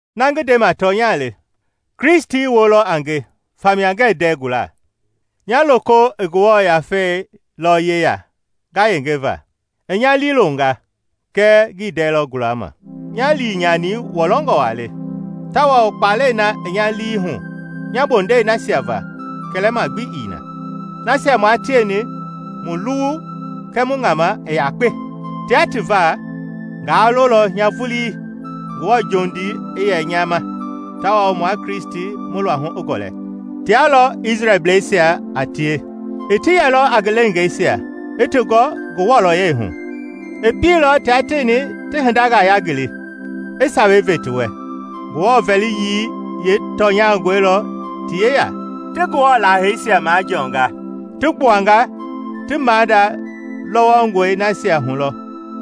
Na ngi ndema tɔnya le; Kristi woo lɔ a nge famia ngɛɛ ndɛɛ gula. Nya lii, toko i Ngewɔ Yafei yeya ngayengeva, i nya liilonga kɛ ngii ndɛɛ lɔ gualama. Nya liinyani wɔlɔngɔ waa le, tawao kpalɛi na i nya lii hu nya bondɛi nasia va kɛlɛma gbi ii ma, nasia maa tieni mu luwu kɛɛ mu ŋama i yakpa! Tia ti va, ngaa lolɔ nya vulii Ngewɔ jondii i yɛ nya ma tawao mua Kristi mu luahu i gɔlɛ. Tia lɔ Isrɛlbleisia a tie; i ti yɛlɔ a ngi leengaa i ti gɔ ngi wɔlɔyɛi hu; i pieilɔ tia tieni ti hindangaa yangili, i Sawei ve ti wɛ; Ngewɔ vɛliyii yeetɔnyangɔi lɔ ti yeya; ti Ngewɔ laaheisia majɔɔnga; ti gbuanga ti maada lɔwɔngɔi nasia hu lɔ,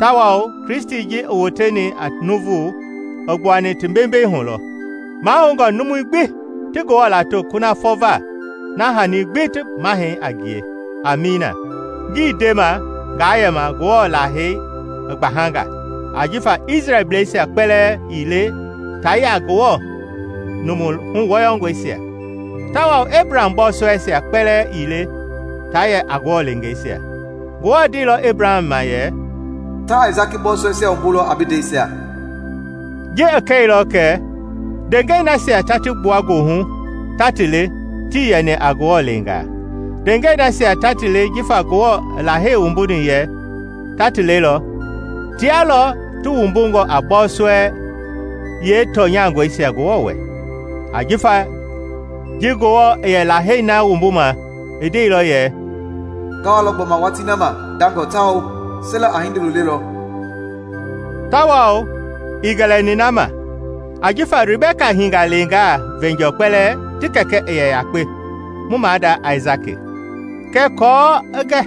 tawao Kristi ji i woteni a nuuvu, i gbuani ti bembei hu lɔ. Mahoungɔ numui gbi ti Ngewɔ lato kunafɔ va na hani gbi ti mahɛi a ngie! Amiina. Ngii ndema ngaa yɛma Ngewɔ lahei i gbahanga; ajifa Isrɛlbleisia kpɛlɛɛ ii le taa yɛ a Ngewɔ numu huwɔyɔngɔisia. Tawao Ebraham bɔɔsɔɛisia kpɛlɛɛ ii lɛ taa yɛ a Ngewɔ leengeisia. Ngewɔ ndeilɔ Ebraham ma yɛ, “Ta Aisaki bɔɔsɔɛisia wumbulɔ a bi ndɛisia.” Ji i kɛilɔ kɛ ndeengɛi nasia ta ti gbua goohu ta ti le tii yɛni a Ngewɔ leengaa; ndeengɛi nasia ta ti le jifa Ngewɔ i Lahei wumbuni yɛ ta ti lelɔ, tia lɔ ti wumbungɔ a bɔɔsɔɛi yeetɔnyangɔisia Ngewɔ wɛ. Ajifa ji Ngewɔ i yɛ Lahei na wumbuma i ndeilɔ yɛ, “Nga walɔ gbɔma watii na ma ndangɔ tawao Sera a hindolo lelɔ.” Tawao ii gɛlɛni na ma. Ajifa Ribɛka hiingaa leengaa veenjɔɔ kpɛlɛɛ ti kɛkɛ i yɛ yakpe, mu maada Aisaki. Kɛɛ aako i gɛ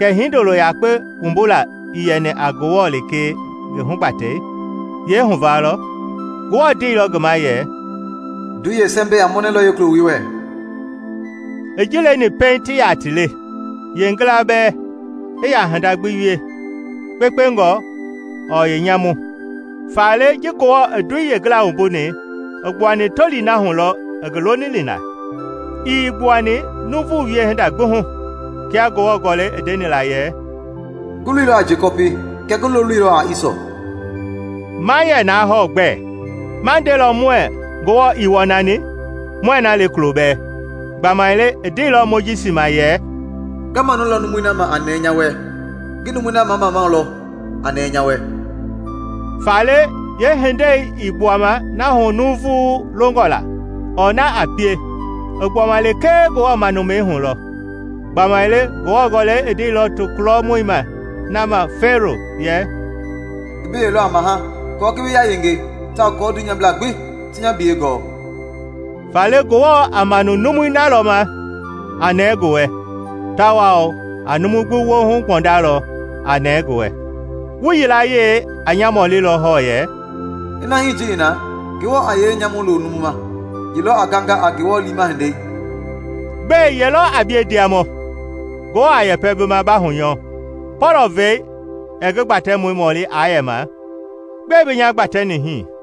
kɛ hindolo yakpe wumbula i yɛni a Ngewɔ lekee ngi hugbatɛi yeehuvaa lɔ, Ngewɔ ndeilɔ ngi ma yɛ, “Ndoi yeesɛmbɛi a mɔnɛlɔ yeekuloi wɛ.” I ji leni pɛiŋ ti yaa ti le, pɛiŋ yeengila bɛɛ i yaa hinda gbi wie, yeekpekpe ɔɔ yeenyamu; faale ji Ngewɔ i ndoi yeengila wumbuni i gbuani tolii na hu lɔ i ngi lolini la, ii gbuani nuuvu wiehinda gbi hu. Kia Ngewɔ Gɔlɛi i ndeni la yɛ, “Ngi loilɔ a Jekɔpi, kɛɛ ngi loloilɔ a Isɔ.” Ma yɛ naa hɔɔ gbɛ? Ma ndelɔ muɛɛ Ngewɔ ii wɔnani? Muɛɛ na le kulo bɛɛ. Gbamaile i ndeilɔ Mojisi ma yɛ, “Nga manulɔ numui na ma nɛɛ nya wɛ, ngi numui na mamamau lɔ a nɛɛ nya wɛ.” Faale yeehindei ii gbuama na hu nuuvu longɔ la ɔɔ na a pie, i gbuama lekee Ngewɔ manumɛi hu lɔ. Gbamaile Ngewɔ Gɔlɛi i ndeilɔ tokulɔ mui na ma Fɛɛro yɛ, “Ngi bi yɛilɔ a maha aako ngi bi yayenge tawao kɔɔ dunyablaa gbi ti nya biyɛi gɔɔ.” Faale Ngewɔ a manu numui na lɔ ma a nɛɛ ngi wɛ, tawao a numu gbi woohu gbɔndalɔ a nɛɛ ngi wɛ. Wu yilayee a nya mɔlilɔ hɔɔ yɛ, “Ina hii ji i na, Ngewɔ a yee nyamu lo numu ma? Ye lɔ a ganga a Ngewɔ liima hindei?” Gbɛe ye lɔ a bie, ndiamɔ, Ngewɔ a yɛpɛ bi ma ba hunyɔɔ? Pɔlɔ-vɛi ɛɛ ngi gbatɛmɔi mɔli aa yɛma, “Gbɛe bi nya gbatɛni hii?”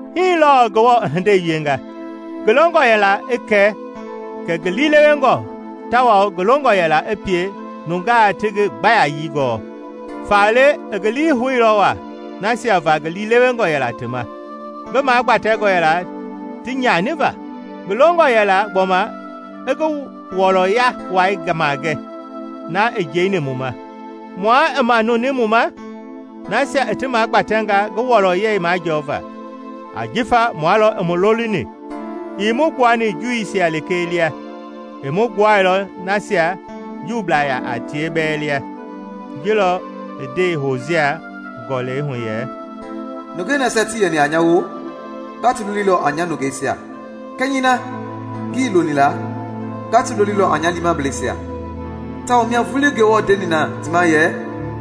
Hii lɔɔ Ngewɔ i hindei wienga. Ngi longɔ yɛla i kɛ kɛ ngi liilewengɔ tawao ngi longɔ yɛla i pie nungaa ti ngi gbayayii gɔɔ. Faale i ngi lii houilɔ waa nasia va ngi liilewengɔ yɛla ti ma, ngi magbatɛngɔ yɛla ti nyaniva. Ngi longɔ yɛla gbɔma i ngi wɔlɔya wai magɛ, na i njeini mu ma, mua i manuni mu ma, nasia i ti magbatɛnga ngi wɔlɔyɛi majɔɔva. Ajifa mua lɔ i mu lolini, ii mu gbuani Juuisia lekee lia, i mu gbuailɔ nasia Juublaa yaa tie bɛɛ lia. Ji lɔ i ndei Hosia Gɔlɛi hu yɛ, “Nungei nasia tii yɛni a nya woo, nga ti lolilɔ a ‘Nya Nungeisia.’ Kɛnyɛi na ngii yɛ loni la, nga ti lolilɔ a ‘Nya Liimableisia.’ Tawao mia vulii Ngewɔ ndeni na ti ma yɛ,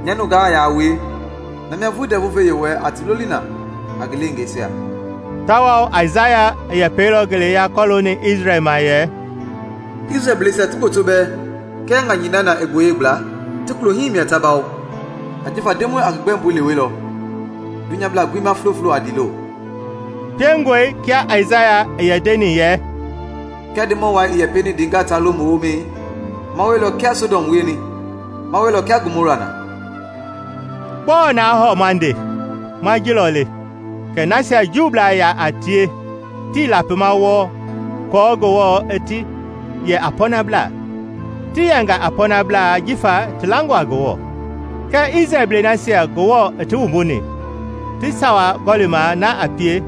‘Nya nungaa yaa a wue,’ na mia vulii ndɛvu-ve-Yewɔɛi a ti loli na a ngi leengeisia.” Tawao Aisaya i yɛpɛilɔ ngeleya kɔlooni Isrɛl ma yɛ, “Isrɛlbleisia ti gboto bɛɛ kia ŋanyɛi na na i gboyei gbla, ti klohii mia ta bawo; ajifa Ndemɔi a ngi gbɛmbui lewelɔ dunyabla gbi ma floflo a ndiilo.” Piengɔe kia Aisaya i yɛ ndeni yɛ, “Kiaa Ndemɔ wai ii yɛ pieni ndeengaa taa lo mu woomɛi, maa wielɔ kia i Sɔdɔm wieni, maa wielɔ kia Gomɔra na.” Gbɔɔ naa hɔɔ ma nde? Ma ji lɔ le: kɛ nasia Juublaa yaa tie tii lapima wɔɔ kɔɔ Ngewɔ i ti yɛ a pɔɔnabla, ti yɛnga a pɔɔnabla jifa ti langɔ a Ngewɔ; Kɛɛ Isrɛlblɛi nasia Ngewɔ i ti wumbuni, ti sawa gɔlima na a pie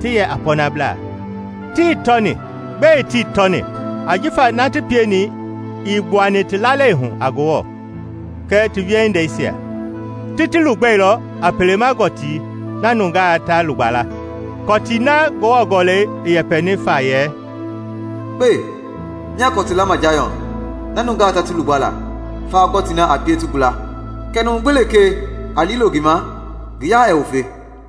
ti yɛ a pɔnabla, tii tɔni. Gbɛe tii tɔni? Ajifa na ti pieni ii gbuani ti lalei hu a Ngewɔ kɛ ti wiehindeisia. Ti lugbɛilɔ a pele-ma-gɔtii na nungaa ta lugba la. Kɔtii na Ngewɔ Gɔlɛi i yɛpɛni fa yɛ, “Kpe, nyaa kɔtu lama Jayɔn na nungaa ta ti lugba la, fawa gɔtii na a pie ti gula, Kɛɛ numu gbi lekee a liilo ngi ma ngi yaa ɛɛ wufe.”